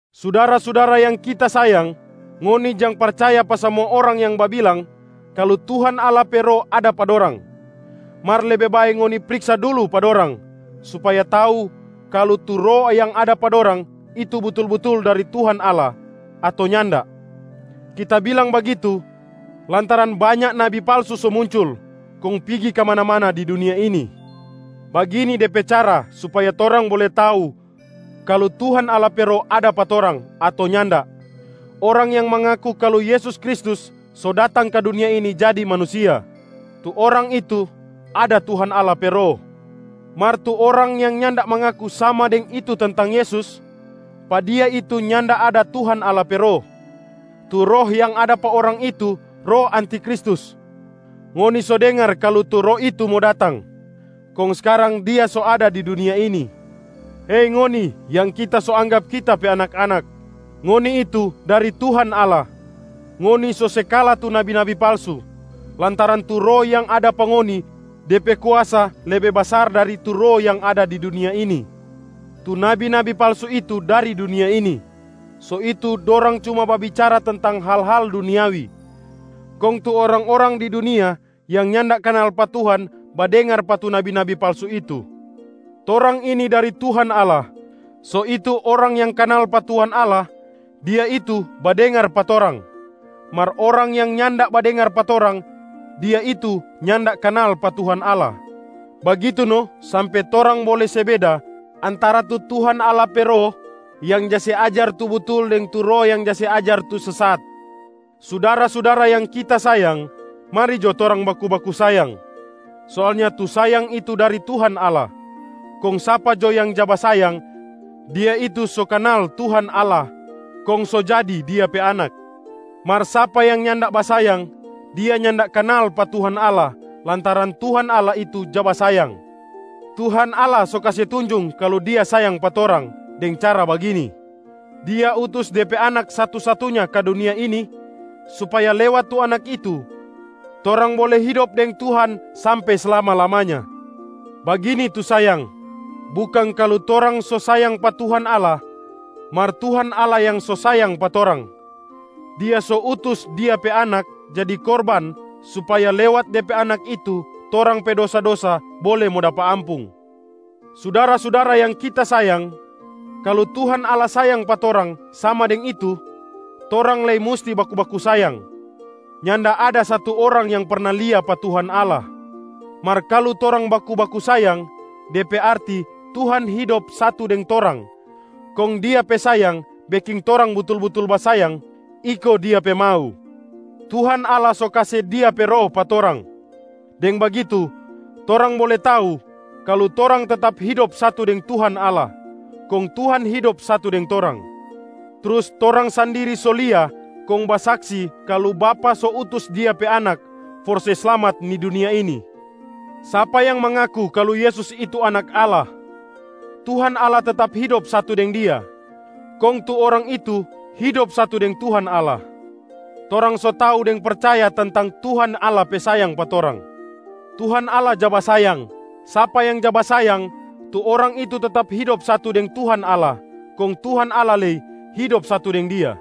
Sudara-sudara yang kita sayang, ngoni jang percaya pa samua orang yang babilang kalu Tuhan Allah pe Roh ada pa dorang. Mar lebe bae ngoni priksa dulu pa dorang supaya tau kalu tu roh yang ada pa dorang itu butul-butul dari Tuhan Allah ato nyanda. Kita bilang bagitu lantaran banya nabi palsu so muncul kong pigi kamana-mana di dunia ini. Bagini de pe cara supaya torang bole tau kalu Tuhan Allah pe Roh ada pa orang ato nyanda: orang yang mangaku kalu Yesus Kristus so datang ka dunia ini jadi manusia, tu orang itu ada Tuhan Allah pe Roh. Mar tu orang yang nyanda mangaku sama deng itu tentang Yesus, pa dia itu nyanda ada Tuhan Allah pe Roh. Tu roh yang ada pa orang itu roh antiKristus. Ngoni so dengar kalu tu roh itu mo datang kong skarang dia so ada di dunia ini. Hei ngoni yang kita so anggap kita pe anak-anak, ngoni itu dari Tuhan Allah. Ngoni so se kala tu nabi-nabi palsu, lantaran tu Roh yang ada pa ngoni de pe kuasa lebe basar dari tu roh yang ada di dunia ini. Tu nabi-nabi palsu itu dari dunia ini, so itu dorang cuma babicara tentang hal-hal duniawi. Kong tu orang-orang di dunia yang nyanda kanal pa Tuhan badengar pa tu nabi-nabi palsu itu. Torang ini dari Tuhan Allah. So itu orang yang kanal pa Tuhan Allah, dia itu badengar pa torang. Mar orang yang nyanda badengar pa torang, dia itu nyanda kanal pa Tuhan Allah. Bagitu no sampe torang bole se beda antara tu Tuhan Allah pe Roh yang ja se ajar tu butul deng tu roh yang ja se ajar tu sesat. Sudara-sudara yang kita sayang, mari jo torang baku-baku sayang. Soalnya tu sayang itu dari Tuhan Allah, kong sapa jo yang ja basayang, dia itu so kanal Tuhan Allah kong so jadi Dia pe anak. Mar sapa yang nyanda basayang, dia nyanda kanal pa Tuhan Allah lantaran Tuhan Allah itu ja basayang. Tuhan Allah so kase tunjung kalu Dia sayang pa torang deng cara bagini: Dia utus De pe Anak satu-satunya ka dunia ini, supaya lewat tu Anak itu torang bole hidop deng Tuhan sampe slama-lamanya. Bagini tu sayang: bukang kalu torang so sayang pa Tuhan Allah, mar Tuhan Allah yang so sayang pa torang. Dia so utus Dia pe Anak jadi korban supaya lewat De pe anak itu torang pe dosa-dosa bole mo dapa ampung. Sudara-sudara yang kita sayang, kalu Tuhan Allah sayang pa torang sama deng itu, torang lei musti baku-baku sayang. Nyanda ada satu orang yang perna lia pa Tuhan Allah. Mar kalu torang baku-baku sayang, de pe arti Tuhan hidop satu deng torang kong Dia pe sayang beking torang butul-butul basayang iko Dia pe mau. Tuhan Allah so kase Dia pe Roh pa torang, deng bagitu torang bole tau kalu torang tetap hidop satu deng Tuhan Allah kong Tuhan hidop satu deng torang. Trus torang sandiri so lia kong basaksi kalu Bapa so utus Dia pe Anak for se slamat ni dunia ini. Sapa yang mangaku kalu Yesus itu Anak Allah, Tuhan Allah tetap hidop satu deng dia, kong tu orang itu hidop satu deng Tuhan Allah. Torang so tau deng percaya tentang Tuhan Allah pe sayang pa torang. Tuhan Allah ja basayang. Sapa yang ja basayang, tu orang itu tetap hidop satu deng Tuhan Allah, kong Tuhan Allah lei hidop satu deng dia.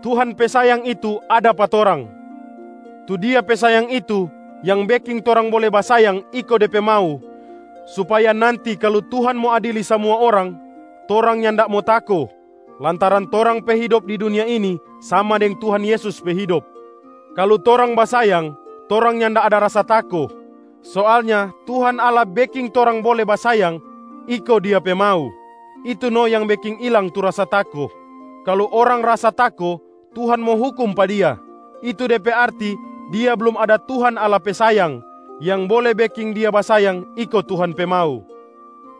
Tuhan pe sayang itu ada pa torang. Tu Dia pe sayang itu yang beking torang bole basayang iko De pe mau supaya nanti kalu Tuhan mo adili samua orang, torang nyanda mo tako lantaran torang pe hidop di dunia ini sama deng Tuhan Yesus pe hidop. Kalu torang basayang, torang nyanda ada rasa tako. Soalnya Tuhan Allah beking torang bole basayang iko Dia pe mau, itu no yang beking ilang tu rasa tako. Kalu orang rasa tako Tuhan mo hukum pa dia, itu de pe arti dia blum ada Tuhan Allah pe sayang yang bole beking dia basayang iko Tuhan pe mau.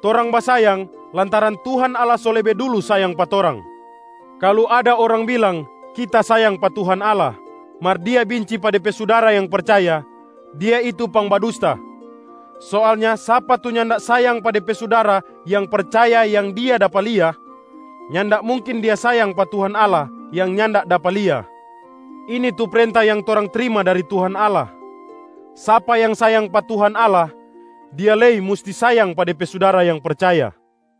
Torang basayang, lantaran Tuhan Allah so lebe dulu sayang pa torang. Kalu ada orang bilang, “Kita sayang pa Tuhan Allah,” mar dia binci pa de pe sudara yang percaya, dia itu pangbadusta. Soalnya sapa tu nyanda sayang pa de pe sudara yang percaya yang dia dapa lia, nyanda mungkin dia sayang pa Tuhan Allah yang nyanda dapa lia. Ini tu prenta yang torang trima dari Tuhan Allah: sapa yang sayang pa Tuhan Allah, dia lei musti sayang pa de pe sudara yang percaya.